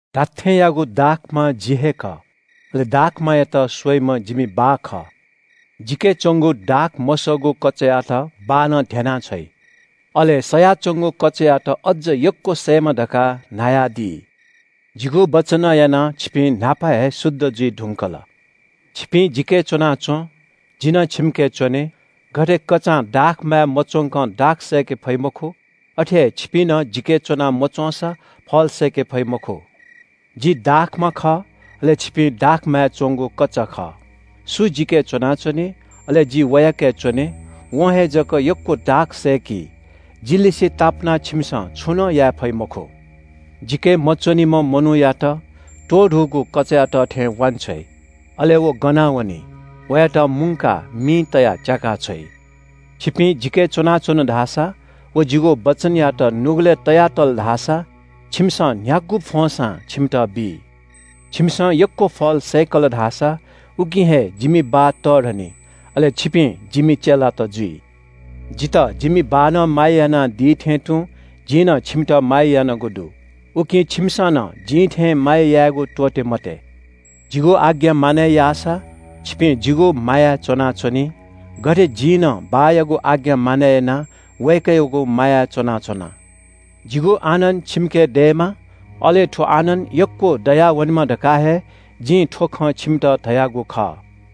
“धात्‍थेंयागु दाखमा जि हे खः, अले दाखमायात स्‍वइम्‍ह जिमि बाः खः। जिके च्‍वंगु दाख मसःगु कचायात बाःनं ध्‍यनाः छ्वइ। अले सयाच्‍वंगु कचायात अझ यक्‍व सयेमा धकाः न्‍हायादी। जिगु वचनं यानाः छिपिं न्‍हापा हे शुद्ध जुइ धुंकल। छिपिं जिके च्‍वनाच्‍वँ, जि नं छिमिके च्‍वने। गथे कचां दाखमाय् मच्‍वंकं दाख सय्‌के फइ मखु, अथे हे छिपिं नं जिके च्‍वना मच्‍वंसा फल सय्‌के फइ मखु। “जि दाखमा खः, अले छिपिं दाखमाय् च्‍वंगु कचा खः। सु जिके च्‍वनाच्‍वनी, अले जि वयाके च्‍वने, वं हे जक यक्‍व दाख सय्‌की। जिलिसें तापानाः छिमिसं छुं नं याये फइ मखु। जिके मच्‍वनीम्‍ह मनूयात त्‍वधूगु कचायात थें वांछ्वइ, अले व गनावनी। वयात मुंकाः मिइ तयाः च्‍याकाछ्वइ। छिपिं जिके च्‍वनाच्‍वन धाःसा व जिगु वचनयात नुगलय् तया तल धाःसा छिमिसं न्‍ह्यागु फ्‍वंसां छिमित बी। छिमिसं यक्‍व फल सय्‌कल धाःसा उकिं हे जिमि बाः तःधनी। अले छिपिं जिमि चेलात जुइ। “जितः जिमि बाःनं माया यानादी थें तुं जिं नं छिमित माया यानागु दु, उकिं छिमिसं नं जिं थें माया यायेगु त्‍वःते मते। जिगु आज्ञा मानय् याःसा छिपिं जिगु मायाय् च्‍वनाच्‍वंनी, गथे जिं नं बाःयागु आज्ञा मानय् यानाः वय्‌कःयागु मायाय् च्‍वनाच्‍वना। जिगु आनन्‍द छिमिके दयेमा, अले थ्‍व आनन्‍द यक्‍व दयावनेमा धकाः हे जिं थ्‍व खँ छिमित धयागु खः।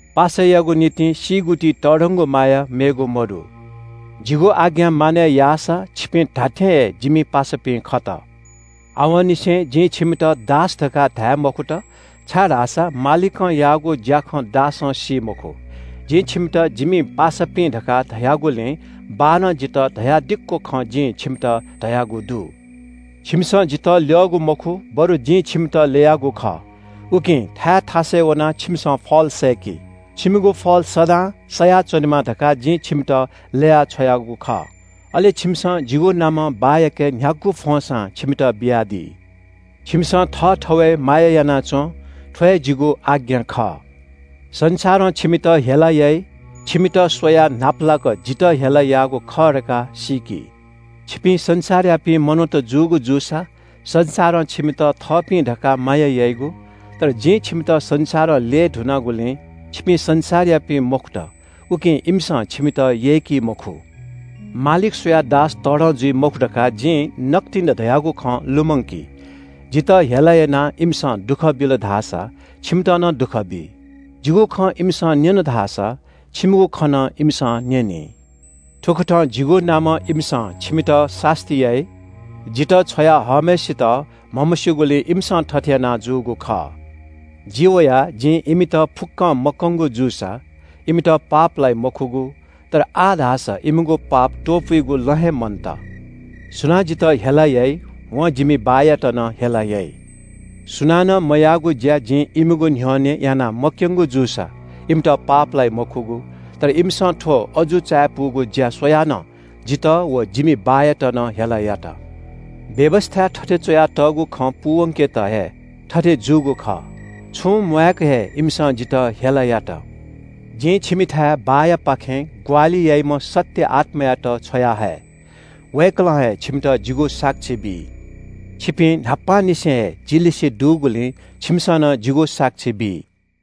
पासायागु निंतिं सीगु ति तःधंगु माया मेगु मदु। जिगु आज्ञा मानय् याःसा छिपिं धात्‍थें हे जिमि पासापिं खत। आवंनिसें जिं छिमित दास धकाः धाये मखुत, छाय्‌धाःसा मालिकं याःगु ज्‍याखँ दासं सी मखु। जिं छिमित जिमि पासापिं धकाः धयागुलिं बाःनं जितः धयादिक्‍व खँ जिं छिमित धयागु दु। छिमिसं जितः ल्‍यःगु मखु, बरु जिं छिमित ल्‍ययागु खः, उकिं थाय् थासय् वनाः छिमिसं फल सय्‌कि। छिमिगु फल सदां सयाच्‍वनेमा धकाः जिं छिमित ल्‍ययाः छ्वयागु खः। अले छिमिसं जिगु नामं बाःयाके न्‍ह्यागु फ्‍वंसां छिमित बियादी। छिमिसं थःथवय् माया याना च्‍वँ – थ्‍व हे जिगु आज्ञा खः।” “संसारं छिमित हेला याइ, छिमित स्‍वयाः न्‍हापालाक जितः हेला याःगु खः धकाः सीकि। छिपिं संसारयापिं मनूत जूगु जूसा संसारं छिमित थःपिं धकाः माया याइगु, तर जिं छिमित संसारं ल्‍यये धुनागुलिं छिपिं संसारयापिं मखुत, उकिं इमिसं छिमित यय्‌की मखु। ‘मालिक स्‍वयाः दास तःधं जुइ मखु’ धकाः जिं नकतिनि धयागु खँ लुमंकी। जितः हेला यानाः इमिसं दुःख बिल धाःसा छिमित नं दुःख बी। जिगु खँ इमिसं न्‍यन धाःसा छिमिगु खँ नं इमिसं न्‍यनी। थुकथं जिगु नामं इमिसं छिमित सास्‍ती याइ। जितः छ्वया हःम्‍हय्‌सित म्‍हमस्‍यूगुलिं इमिसं थथे याना जूगु खः। जि वयाः जिं इमित फुक्‍कं मकंगु जूसा इमित पाप लाइ मखुगु। तर आः धाःसा इमिगु पाप त्‍वपुइगु लँ हे मन्‍त। सुनां जितः हेला याइ वं जिमि बाःयात नं हेला याइ। सुनानं मयाःगु ज्‍या जिं इमिगु न्‍ह्यःने यानाः मक्‍यंगु जूसा इमित पाप लाइ मखुगु। तर इमिसं थ्‍व अजू चायापुगु ज्‍या स्‍वयाः नं जितः व जिमि बाःयात नं हेला यात। व्‍यवस्‍थाय् थथे च्‍वयातःगु खँ पूवंकेत हे थथे जूगु खः – ‘छुं म्‍वाय्‌क हे इमिसं जितः हेला यात।’ “जिं छिमिथाय् बाःयापाखें ग्‍वाहालि याइम्‍ह सत्‍य आत्‍मायात छ्वयाहये। वय्‌कलं हे छिमित जिगु साक्षी बी। छिपिं न्‍हापांनिसें हे जि लिसे दुगुलिं छिमिसं नं जिगु साक्षी बी।”